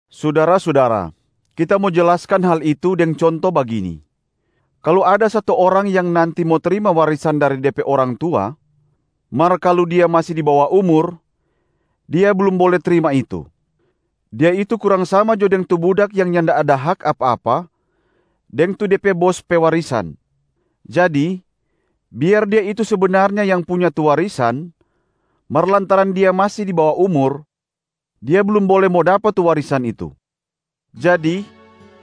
Sudara-sudara, kita mo jelaskan hal itu deng conto bagini: kalu ada satu orang yang nanti mo trima warisan dari de pe orang tua, mar kalu dia masi di bawa umur, dia blum bole trima itu. Dia itu kurang sama jo deng tu budak yang nyanda ada hak apa-apa deng tu de pe bos pe warisan. Jadi biar dia itu sebenarnya yang punya tu warisan, mar lantaran dia masi di bawa umur, dia blum bole mo dapa tu warisan itu. Jadi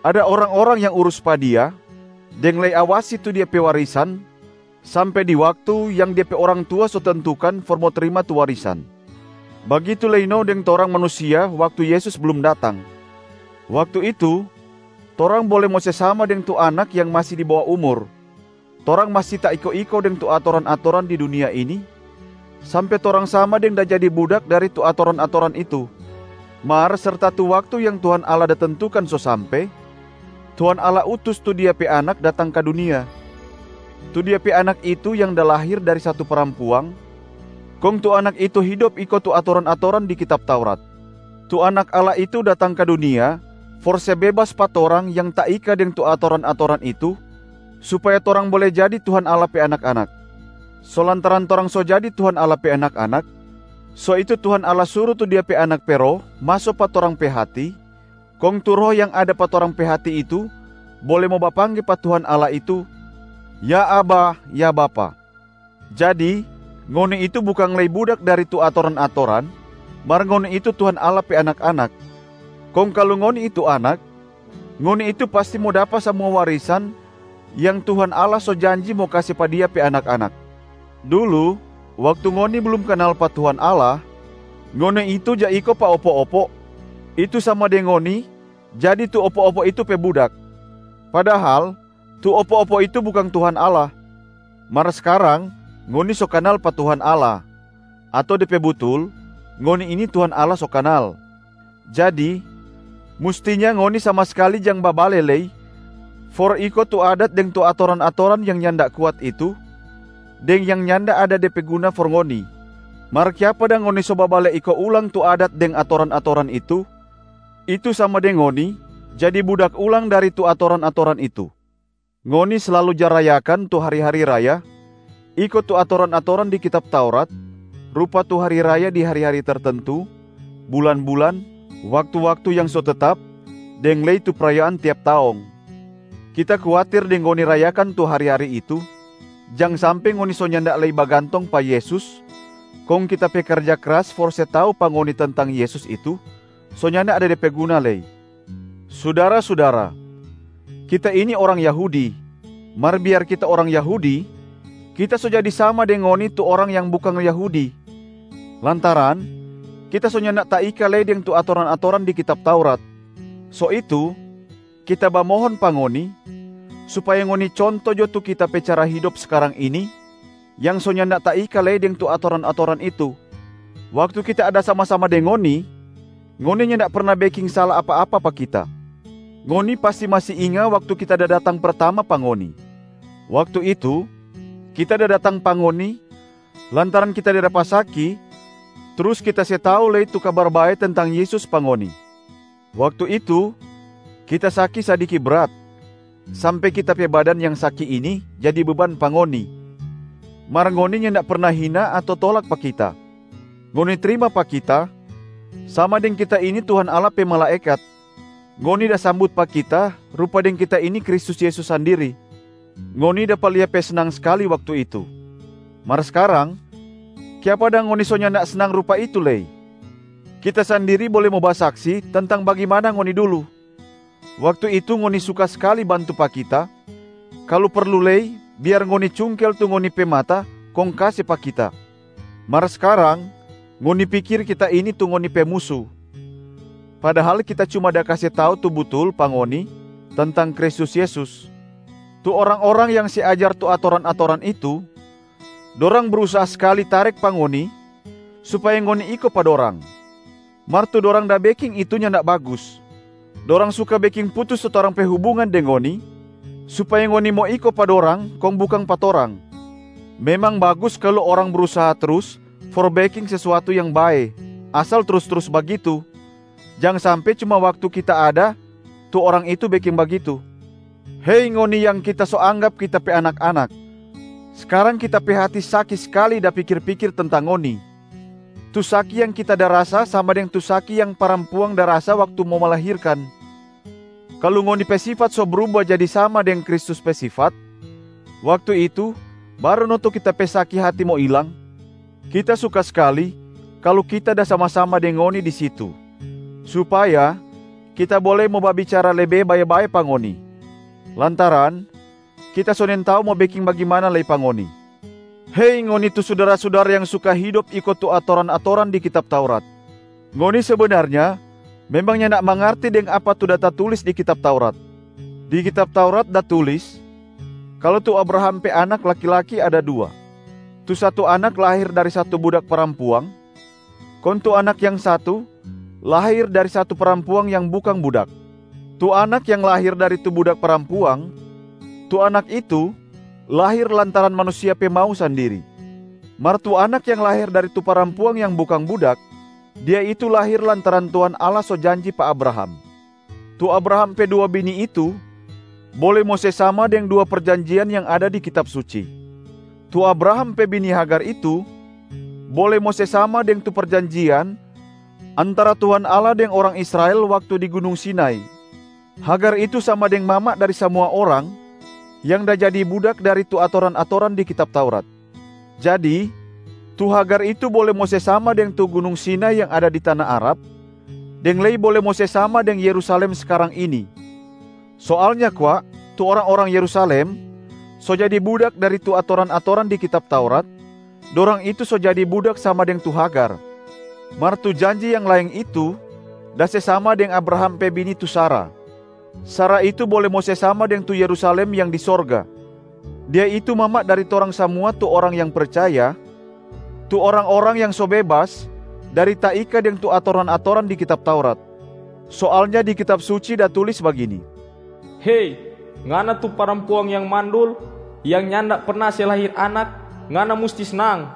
ada orang-orang yang urus pa dia deng lei awasi tu dia pe warisan sampe di waktu yang de pe orang tua so tentukan for mo trima tu warisan. Bagitu lei no deng torang manusia waktu Yesus blum datang, waktu itu torang bole mo se sama deng tu anak yang masi di bawa umur, torang masi taiko-iko deng tu atoran-atoran di dunia ini sampe torang sama deng da jadi budak dari tu atoran-atoran itu. Mar serta tu waktu yang Tuhan Allah da tentukan so sampe, Tuhan Allah utus tu Dia pe Anak datang ka dunia. Tu Dia pe Anak itu yang da lahir dari satu parampuang, kong tu Anak itu hidop iko tu atoran-atoran di kitab Taurat. Tu Anak Allah itu datang ka dunia for se bebas pa torang yang taika deng tu atoran-atoran itu supaya torang bole jadi Tuhan Allah pe anak-anak. So lantaran torang so jadi Tuhan Allah pe anak-anak, so itu Tuhan Allah suru tu Dia pe Anak pe Roh maso pa torang pe hati, kong tu Roh yang ada pa torang pe hati itu bole mo bapangge pa Tuhan Allah itu, “Ya Abba, ya Bapa”. Jadi ngoni itu bukang lei budak dari tu atoran-atoran mar ngoni itu Tuhan Allah pe anak-anak. Kong kalu ngoni itu anak, ngoni itu pasti mo dapa samua warisan yang Tuhan Allah so janji mo kase pa Dia pe anak-anak. Dulu waktu ngoni blum kanal pa Tuhan Allah, ngoni itu ja iko pa opo-opo, itu sama deng ngoni jadi tu opo-opo itu pe budak, padahal tu opo-opo itu bukang Tuhan Allah. Mar skarang ngoni so kanal pa Tuhan Allah, ato de pe butul ngoni ini Tuhan Allah so kanal. Jadi mustinya ngoni sama skali jang babale lei for iko tu adat deng tu atoran-atoran yang nyanda kuat itu deng yang nyanda ada de pe guna for ngoni. Mar kiapa dang ngoni so babale iko ulang tu adat deng atoran-atoran itu, itu sama deng ngoni jadi budak ulang dari tu atoran-atoran itu. Ngoni slalu ja rayakan tu hari-hari raya iko tu atoran-atoran di kitab Taurat rupa tu hari raya di hari-hari tertentu, bulan-bulan, waktu-waktu yang so tetap deng lei tu prayaan tiap taong. Kita kuatir deng ngoni rayakan tu hari-hari itu, jang sampe ngoni so nyanda lei bagantong pa Yesus kong kita pe karja kras for se tau pa ngoni tentang Yesus itu so nyanda ada de pe guna lei. Sudara-sudara, kita ini orang Yahudi mar biar kita orang Yahudi, kita so jadi sama deng ngoni tu orang yang bukang Yahudi lantaran kita so nyanda taika lei deng tu atoran-atoran di kitab Taurat. So itu, kita bamohon pa ngoni supaya ngoni conto jo tu kita pe cara hidop skarang ini yang so nyanda taika lei deng tu atoran-atoran itu. Waktu kita ada sama-sama deng ngoni, ngoni nyanda perna beking sala apa-apa pa kita. Ngoni pasti masi inga waktu kita da datang pertama pa ngoni. Waktu itu, kita da datang pa ngoni lantaran kita da dapa saki trus kita se tau lei tu Kabar Bae tentang Yesus pa ngoni. Waktu itu, kita saki sadiki brat sampe kita pe badan yang saki ini jadi beban pa ngoni, mar ngoni nyanda perna hina ato tolak pa kita, ngoni trima pa kita sama deng kita ini Tuhan Allah pe malaekat, ngoni da sambut pa kita rupa deng kita ini Kristus Yesus sandiri. Ngoni dapa lia pe snang skali waktu itu. Mar skarang, kiapa dang ngoni so nyanda snang rupa itu lei? Kita sandiri bole mo basaksi tentang bagimana ngoni dulu, waktu itu ngoni suka skali bantu pa kita, kalu perlu lei biar ngoni cungkel tu ngoni pe mata kong kase pa kita. Mar skarang ngoni pikir kita ini tu ngoni pe musu, padahal kita cuma da kase tau tu butul pa ngoni tentang Kristus Yesus. Tu orang-orang yang se ajar tu atoran-atoran itu, dorang brusaha skali tarek pa ngoni supaya ngoni iko pa dorang, mar tu dorang da beking itu nyanda bagus. Dorang suka beking putus tu torang pe hubungan deng ngoni supaya ngoni mo iko pa dorang kong bukang pa torang. Memang bagus kalu orang brusaha trus for beking sesuatu yang bae asal trus-trus bagitu, jang sampe cuma waktu kita ada tu orang itu beking bagitu. Hei ngoni yang kita so anggap kita pe anak-anak, skarang kita pe hati saki skali da pikir-pikir tentang ngoni, tu saki yang kita da rasa sama deng tu saki yang parampuang da rasa waktu mo melahirkan. Kalu ngoni pe sifat so bruba jadi sama deng Kristus pe sifat, waktu itu baru no tu kita pe saki hati mo ilang. Kita suka skali kalu kita da sama-sama deng ngoni di situ supaya kita bole mo babicara lebe bae-bae pa ngoni, lantaran kita so nintau mo beking bagimana lei pa ngoni. Hei ngoni tu sudara-sudara yang suka hidop iko tu atoran-atoran di kitab Taurat, ngoni sebenarnya memang nyanda mangarti deng apa tu da tatulis di kitab Taurat. Di kitab Taurat da tulis kalu tu Abraham pe anak laki-laki ada dua. Tu satu anak lahir dari satu budak parampuang, kong tu anak yang satu lahir dari satu parampuang yang bukang budak. Tu anak yang lahir dari tu budak parampuang, tu anak itu lahir lantaran manusia pe mau sandiri. Mar tu anak yang lahir dari tu parampuang yang bukang budak, dia itu lahir lantaran Tuhan Allah so janji pa Abraham. Tu Abraham pe dua bini itu bole mo se sama deng dua perjanjian yang ada di Kitab Suci. Tu Abraham pe bini Hagar itu bole mo se sama deng tu perjanjian antara Tuhan Allah deng orang Israel waktu di Gunung Sinai. Hagar itu sama deng mama dari samua orang yang da jadi budak dari tu atoran-atoran di kitab Taurat. Jadi tu Hagar itu bole mo se sama deng tu Gunung Sinai yang ada di tana Arab, deng lei bole mo se sama deng Yerusalem skarang ini. Soalnya kwa tu orang-orang Yerusalem so jadi budak dari tu atoran-atoran di kitab Taurat, dorang itu so jadi budak sama deng tu Hagar. Mar tu janji yang laeng itu da se sama deng Abraham pe bini tu Sara. Sara itu bole mo se sama deng tu Yerusalem yang di sorga. Dia itu mama dari torang samua tu orang yang percaya, tu orang-orang yang so bebas dari taika deng tu atoran-atoran di kitab Taurat. Soalnya di Kitab Suci da tulis bagini, “Hei ngana tu parampuang yang mandul, yang nyanda perna se lahir anak, ngana musti snang!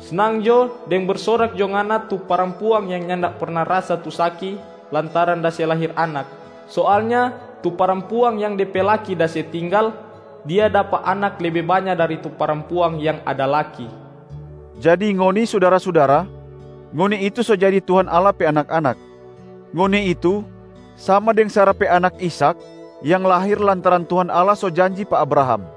Snang jo deng bersorak jo ngana tu parampuang yang nyanda perna rasa tu saki lantaran da se lahir anak! Soalnya tu parampuang yang de pe laki da se tinggal, dia dapa anak lebe banya dari tu parampuang yang ada laki.” Jadi ngoni sudara-sudara, ngoni itu so jadi Tuhan Allah pe anak-anak. Ngoni itu sama deng Sara pe anak Ishak yang lahir lantaran Tuhan Allah so janji pa Abraham.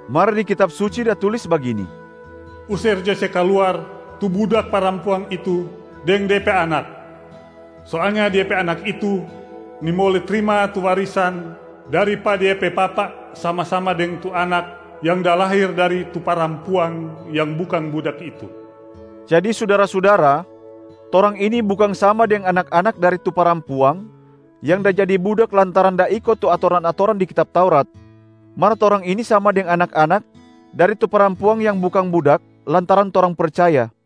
Mar di Kitab Suci da tulis bagini, “User jo se kaluar tu budak parampuang itu deng de pe anak. Soalnya dia pe anak itu nimbole trima tu warisan dari pa de pe papa sama-sama deng tu anak yang da lahir dari tu parampuang yang bukang budak itu.” Jadi sudara-sudara, torang ini bukang sama deng anak-anak dari tu parampuang yang da jadi budak lantaran da iko tu atoran-atoran di kitab Taurat, mar torang ini sama deng anak-anak dari tu parampuang yang bukang budak lantaran torang percaya.